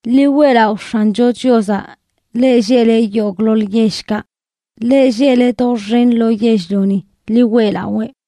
Ḻi weꞌlaꞌo X̱ancho Chiozaꞌ, leꞌ lleꞌle yogꞌḻoḻ yellkaꞌ; leꞌ lleꞌle doxen lo yell-lioni, ḻi weꞌlawee.